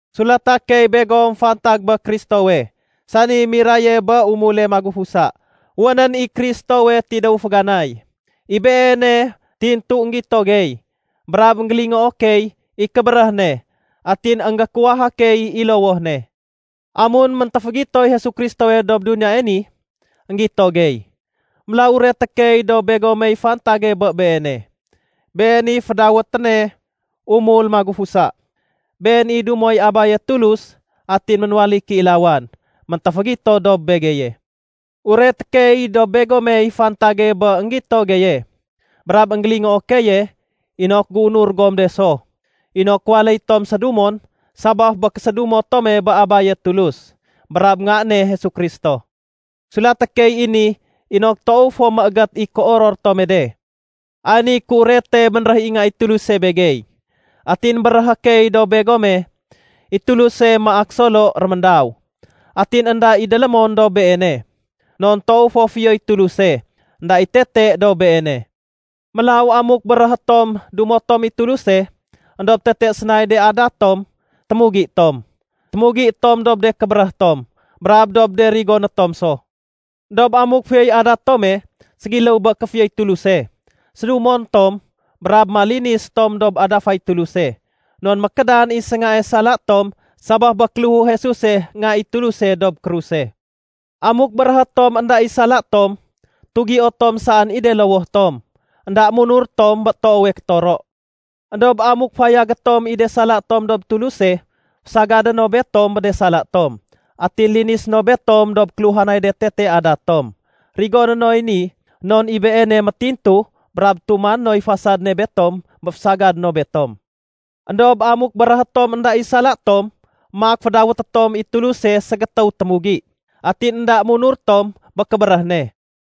Sulata key begom fantag bé Kristowe, sani miraye bé umule magufusa. Wénén i Kristowe tidéw féganay. I Beene tintu énggito gey, brab énggélingoo key i kébéréh ne, atin énggékuwaha key i lowoh ne. Amun méntéfégitoy Jesu Kristowe dob duniyae ni, énggito gey. Mélaw ureté key dob begomey fantage bé Beene. Been i fédawéténe “Umul Magufusa”. Been i dumoy Abaye Tulus atin ménwaléy kéilawan méntéfégito dob begeye. Ureté key dob begomey fantage bé énggito geye brab énggélingoo keye inok géunur gom de so inok waléy tom sédumon sabaf bé késédumo tome bé Abaye Tulus brab Nga ne Jesu Kristo. Sulaté key i ni inok toow fo méégét i kéoror tome de. Ay niy kéurete bénréh i Nga i Tuluse begey atin béréhé key dob begome: I Tuluse maak Solo réméndaw, atin énda i délémon dob Beene. Non toow fo fiyoy Tuluse, énda i tete dob Beene. Mélaw amuk béréhé tom dumo tom i Tuluse, éndob tete sénay de adat tom, témugi tom. Témugi tom dob de kébéréh tom brab dob de rigoné tom so. Endob amuk fiyoy adat tome ségiléw bé kéfiyoy Tuluse, sédumon tom brab malinis tom dob adafay Tuluse non mékédan i séngae sala tom sabaf bé kéléhu Jesuse Nga i Tuluse dob kruse. Amuk béréhé tom énda i sala tom, tugio tom saén i de lowoh tom, énda munur tom bé toowe kétoro. Endob amuk fayagé tom i de sala tom dob Tuluse, fésagadé no betom bé de sala tom atin linisé no betom dob kéluhanay de tete adat tom. Rigoné noy ni non i Beene métintu brab tumané noy fasad ne betom bé fésagadé no betom. Endob amuk béréhé tom énda i sala tom, maak fédawété tom i Tuluse ségétéw témugi, atin énda munur tom bé kébéréh ne.